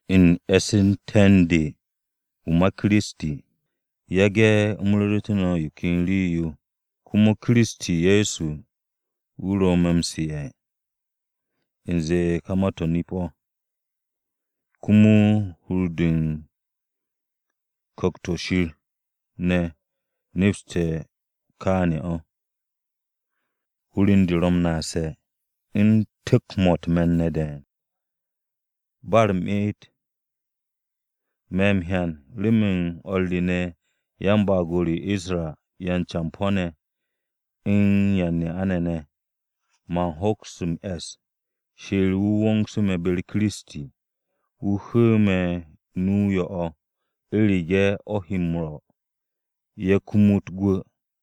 U̱n e̱sse̱nte̱ u̱n de wu̱ ma Kiristi, yage̱ u̱m ru̱ru̱tu̱ no̱ yo ken rii-yo, komo Kiristi Ye̱so wu̱ ro̱ me̱ m-su̱'e̱, u̱nze ka ma-to̱ nip-o̱. Komo hur u̱n de u̱n Ku̱kt-o̱ Shir ne̱ nepste̱ kaane̱ o̱. Hur u̱n de ro̱ m-naase̱, u̱n tu̱k-mo̱ u̱t-me̱n ne̱ de̱e̱n, ba u̱r-me'et. Me̱ m-hyan remen o̱r re ne̱ yan-baag-o re Isra-ne̱ yan-campo̱-ne̱ u̱n yan-ne'a-ne̱ ne̱, man hoks m-e̱ss Shir wu̱ wongsu̱ me̱ be-u̱r Kiristi, wu̱ hu̱u̱ me̱ nu-o yo̱-o̱ u̱rege̱ o̱ he m-rwo̱ ye̱ kumut gwu̱.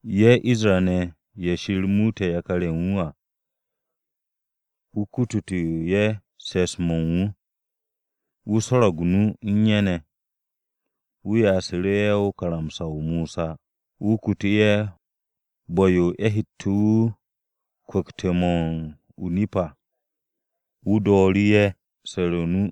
Ye̱ Isra-ne̱, ye̱ Shir muute̱ yakar-ye̱ u̱n wu̱ à, wu̱ kutute̱ ye̱ se̱ps-mo̱ u̱n wu̱. Wu̱ swo̱ro̱g u̱s-nu u̱n ye̱ ne̱. Wu̱ ya'asu̱ru̱ ye̱ karamsa-o Mosa. Wu̱ kutu̱ ye̱ bu̱-yo ye̱ hette̱ wu̱ m-kwu̱kt mo̱, o-nip à. Wu̱ dooru̱ ye̱ su̱re̱ u̱s-nu.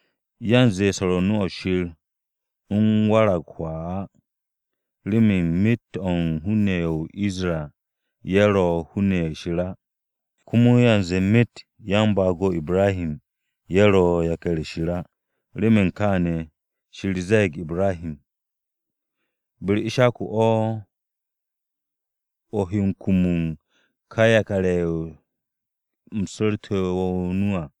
Yanze swo̱r o-nu o̱ Shir u̱n warag hwaa á, remen myet o̱ u̱n hun-ne̱ ye̱ o-Isra ye̱ ro̱ hun-ne̱ ye̱ Shir á. Komo yanze myet yan-baag-o Ibrahi ye̱ ro̱ yakar-ye̱ Shir á. Remen kaane̱, Shir ze̱e̱g Ibrahi, “Be-u̱r Ishaku o̱ o he m-kum u̱n ka yakar-ye̱ u̱m su̱ru̱te̱ wo̱ nu à.”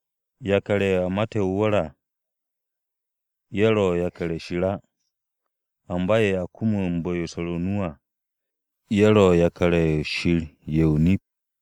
Yakar-ye̱ a mate̱ o-wu̱r à, ye̱ ro̱ yakar-ye̱ Shir á, amba ye̱ a m-kum u̱n bu̱-yo u̱n swo̱r o-nu à, ye̱ ro̱ yakar-ye̱ Shir ye̱ o-nip.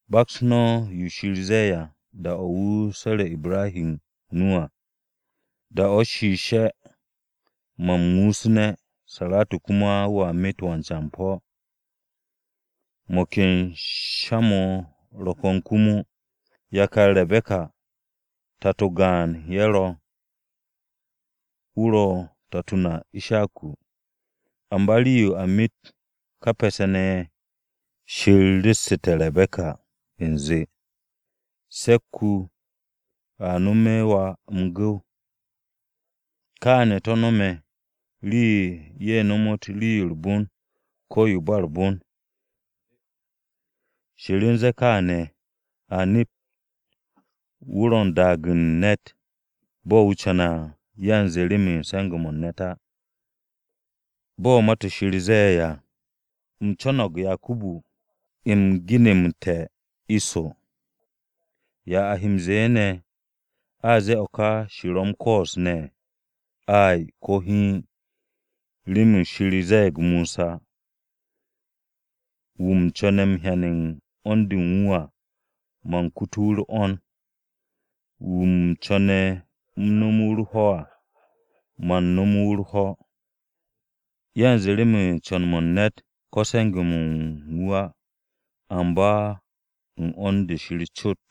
Baks no̱ yo Shir ze̱e̱ à, da-o̱ wu̱ su̱re̱ Ibrahi o-nu à, “Da-o̱ wo'e̱, man muusu̱ne̱, Saratu komo a met wan-campo̱.” Mo̱ ken sha-mo̱ ro̱ ko̱n komo. Yakar Rebe̱ka tato-o gaan ye̱ ro̱, wu̱ ro̱ tato na Ishaku. Amba rii-yo a met ka pe̱se̱-ne̱ ye̱, Shir ru̱ssu̱te̱ Rebe̱ka u̱nze, “Se̱k-wu̱ a no̱me̱ wà m-gu̱w.” Kaane̱ to̱ no̱me̱ rii-yo ye̱ nomot rii-yo u̱r-bon ko̱ yo u̱n ba u̱r-bon. Shir u̱n ze̱e̱ kaane̱ a nept wu̱ ro̱ u̱n daag u̱n ne̱t bo̱ wu̱ co̱ne̱ à yanze remen se̱nge̱-mo̱ u̱n ne̱t á. Bo̱ Ma-to̱ Shir ze̱e̱ à, “U̱m co̱no̱g Yakubu, u̱m ginu̱mte̱ Iso.” ¿Ya a he m-ze̱e̱ ne̱? ¿A zee o̱ Shir ro̱ m-koos ne̱? Ay! Ko̱ hiin! Remen Shir ze̱e̱g Mosa, “Wu̱ u̱m co̱ne̱ u̱m hyen 'wo̱n-de u̱n wu̱ à, man kutu̱ wu̱ u̱r-'wo̱n, Wu̱ u̱m co̱ne̱ u̱m no̱me̱ wu̱ u̱r-ho̱ à, man no̱me̱ wu̱ u̱r-ho̱.” Yanze remen co̱n-mo̱ u̱n ne̱t ko̱ se̱nge̱-mo̱ u̱n wu̱ á, amba u̱n 'wo̱n-de Shir cot.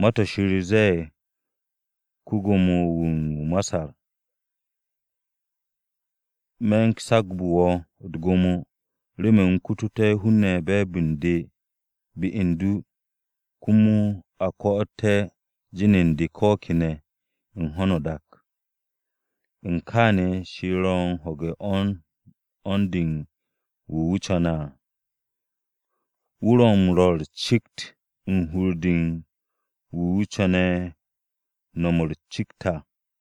Ma-to̱ Shir ze̱e̱g ko-Gwo̱mo-wu̱ o-Masar, “Me̱ u̱n sagbu̱ wo̱ u̱t-gwo̱mo remen u̱m kututé̱ hun-ne̱ be̱e̱b u̱n de be u̱n du, komo a ko̱'o̱te̱ jin u̱n de ko̱ kene̱ u̱n ho̱no o-dak.” U̱n kaane̱ Shir ro̱ u̱n ho̱ge̱ u̱r-'wo̱n de u̱n wu̱ wu̱ co̱ne̱ à, wu̱ ro̱ u̱n rwo̱ u̱r-cikt u̱n hur-de u̱n wu̱ co̱ne̱ no̱m u̱r-cikt à.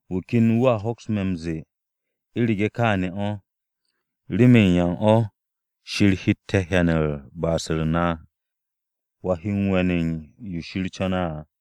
Wu̱ ken wu̱a hoks me̱ m-ze̱e̱, “U̱rege̱ kaane̱ o̱, ¿remen yan o̱ Shir hette̱ hyan u̱n ba'as-u̱r na? ¿Wa he m-we̱n u̱n yo Shir co̱ne̱ à?”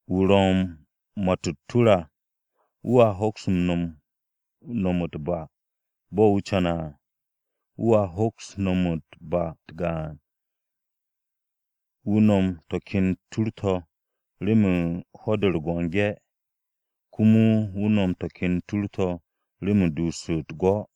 Wu̱ ro̱ u̱n ma-to̱ u̱t-tur à wu̱a hoks m-no̱m u̱t-ba bo̱ wu̱ co̱ne̱ à. Wu̱a hoks m-no̱m u̱n ba-u̱t gaan wu̱ no̱m to̱ ken tur-to̱ remen ho̱-de o-biki, komo wu̱ no̱m to̱ ken tur-to̱ remen duus u̱t-gwo̱.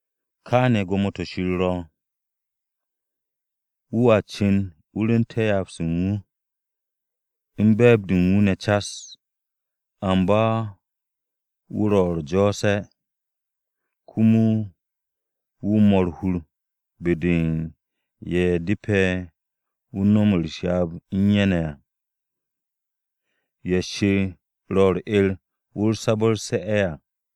Kaane̱ gwo̱mo-to̱ Shir ro̱, wu̱a cu̱n wu̱ rwu̱u̱nte̱ ryaab-se u̱n wu̱, u̱n be̱e̱b-de u̱n wu̱ ne̱ cas. Amba wu̱ ro̱ u̱r-jo̱o̱se̱, komo wu̱ 'mo u̱r-hur be-de u̱n ye̱ depe̱ wu̱ no̱m u̱s-ryaab u̱n ye̱ ne̱ à. Ye̱ Shir ro̱ u̱r-'er wu̱ sabu̱rse̱ à.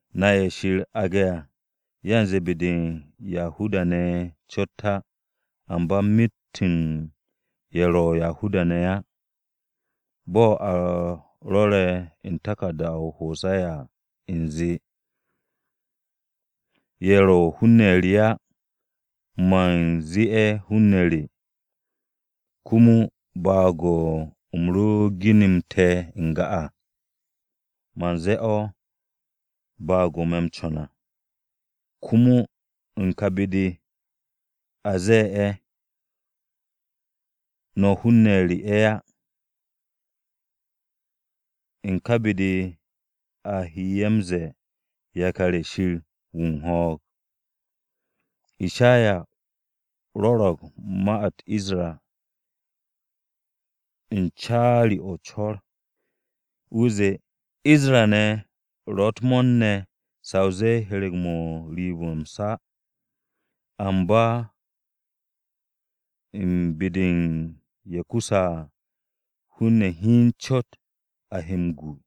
Na ye̱ Shir aage̱ à, yanze be-de u̱n Yahuda-ne̱ cot á, amba myet u̱n ye̱ ro̱ Yahuda-ne̱ á. Bo̱ a rwo̱re̱ u̱n taku̱rda-o Hose̱ya à u̱nze: “Ye̱ ro̱ hun-ne̱ re á, man zee ye̱ ‘Hun-ne̱ re.’ Komo baag-o̱ u̱m ro ginu̱mte̱ n-ga à, man zee o̱ ‘Baag-o̱ me̱ m-co̱n à.’” Komo, “U̱n ka be-de a zee ye̱: ‘No̱ hun-ne̱ re ye̱ á,’ u̱n ka be-de a he ye̱ m-ze̱e̱, ‘Yakar-ye̱ Shir wu̱ u̱n ho̱o̱g.’” Ishaya rwo̱ro̱g ma-u̱t Isra u̱n caari-o̱ o-co̱r, wu̱ zee, “Isra-ne̱ ro̱ u̱t-mo̱o̱r ne̱ sa o zee hyereg-mo̱ u̱n riib-o̱ m-sa, amba u̱n be-de u̱n ye̱ kusse̱ à, hun-ne̱ hiin cot a he m-gu.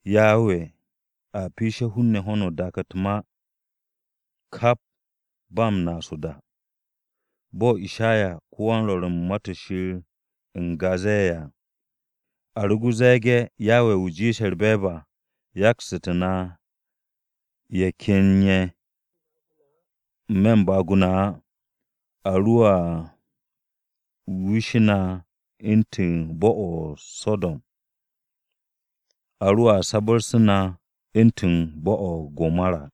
Yawe a piishe̱ ho̱no o-dak u̱t-ma, kap ba u̱n naas o-da.” Bo̱ Ishaya ko-wan-Rwo̱r u̱n Ma-to̱ Shir n-ga zee à: “A ro ze̱e̱ge̱ Yawe wu̱ jiishe̱ u̱r-be̱e̱b à yaksu̱tu̱ na ye̱ ken ye̱ n-me̱ u̱n baag-o na á, A roa wishe̱ na u̱ntu̱n bo̱-o̱ o-So̱do̱m, a roa sabarse̱ na u̱ntu̱n bo̱-o̱ o-Gomora.”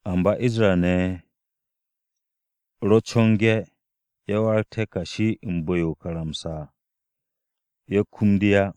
Amba Isra-ne̱ ye̱ ro co̱nge̱, ye̱ warag kashi u̱n bu̱-yo o-karamsa à, ye̱ kum de á.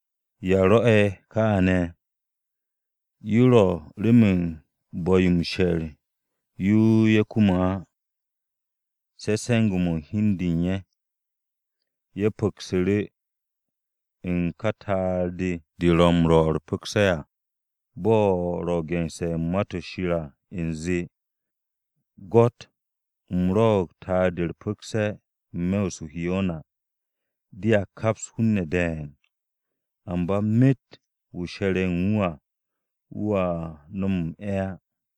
¿Ya rwo̱'e̱ kaane̱? Yo ro̱ remen u̱n bu̱-yo m-she̱r yo ye̱ kume̱ á, se̱ se̱nge̱-mo̱ u̱n hi u̱n de u̱n ye̱. Ye̱ pu̱ksu̱ru̱ u̱n “ka ta'ar-de ro̱ m-'rwo̱ u̱r-pu̱kse̱ à.” Bo̱ ro̱ gense̱ u̱n Ma-to̱ Shir à u̱nze: “Gwo̱t u̱m rwo̱'o̱g ta'ar-de u̱r-pu̱kse̱ n-me̱ o-Urusharima. Dea kaps hun-ne̱ de̱e̱n. Amba myet wu̱ she̱re̱ u̱n wu̱ à, wu̱a no̱m m-'e̱ á.”